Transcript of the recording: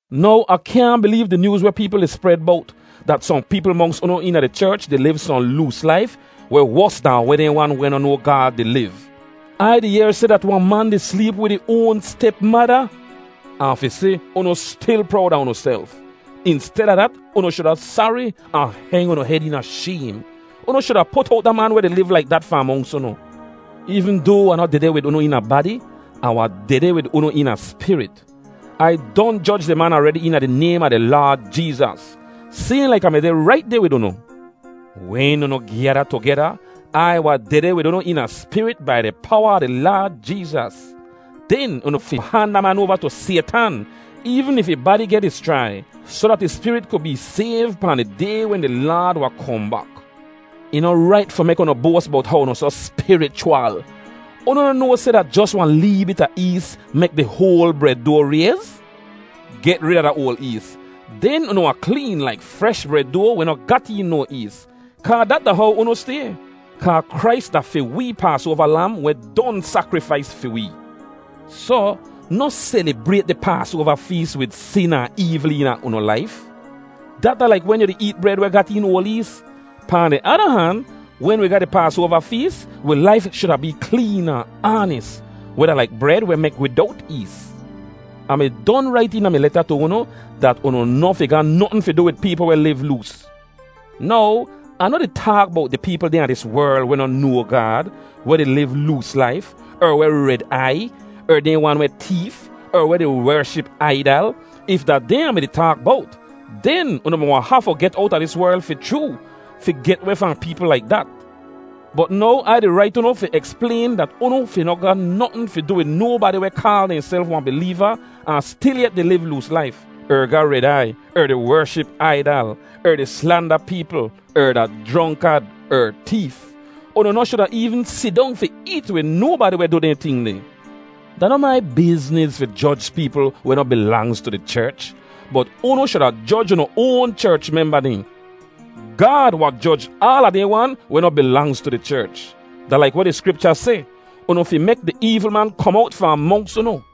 Now, Ah kyaahn bileev di nyooz weh peepl di spred bowt, dat sohn peepl monks unu eena di cherch di liv sohn loos laif weh wos dahn weh dehn wan weh noh noa Gaad di liv. Ai di yehr seh dat wahn man di sleep wid ih oan step-mada! Ahn fi si, unu stil prowd a unuself! Insteda dat, unu shuda sari, ahn heng unu hed eena shaym. Unu shuda put owt da man weh di liv laik dat fahn monks unu. Eevn doa Ah noh dehdeh wid unu eena badi, Ah wahn dehdeh wid unu eena spirit. Ai don joj di man aredi eena di naym a di Laad Jeezas, sayhn laik Ah mi deh rait deh wid unu. Wen unu gyada tugeda Ai wahn dehdeh wid unu eena spirit bai di powa a di Laad Jeezas. Den unu fi han da man oava tu Saytan, eevn if ih badi geh dischrai, soh dat ih spirit ku bee sayv pahn di Day wen di Laad wahn kohn bak. Ih noh rait fi mek unu boas bowt how unu soh spirichwal. Unu noh noa seh dat jos wahn lee bit a ees mek di hoal bred doa rayz? Get rid a da oal ees. Den unu wahn kleen laik fresh bred doa weh noh gat een no ees, kaa dat da how unu stay, kaa Krais da fi wee Paasoava Lam weh don sakrifais fi wee. Soh, noh selibrayt di Paasoava fees wid sin ahn eevl eena unu laif. Dat da laik wen yu di eet bred weh gat een oal ees. Pahn di ada han, wen wi ga di Paasoava fees, wi laif shuda bee kleen ahn aanis, weh da laik bred weh mek widowt ees. Ah mi don rait eena mi leta tu unu, dat unu noh fi ga notn fi du wid peepl weh liv loos. Now, Ah noh di taak bowt di peepl dehn a dis werl weh noh noa Gaad, weh di liv loos laif, er weh red aiy, er dehn wan weh teef, er weh di wership aidal. If da dehn Ah mi-di taak bowt, den unu mi wahn hafu get owta dis werl fi chroo, fi get weh fahn peepl laik dat. Bot now Ai di rait unu fi eksplayn dat unu fi noh ga notn fi du wid nobadi weh kaal dehnself wahn bileeva ahn stilyet di liv loos laif, er ga red aiy, er di wership aidal, er di slanda peepl, er da jronkad, er teef. Unu noh shuda eevn sidong fi eet wid nobadi weh du dehn ting deh. Da noh mai bizniz fi joj peepl weh noh bilangz tu di cherch; bot unu shuda joj unu oan cherch memba dehn. Gaad wahn joj aala dehn wan weh noh bilangz tu di cherch. Da laik weh di Skripcha seh, “Unu fi mek di eevl man kom owt fahn monks unu.”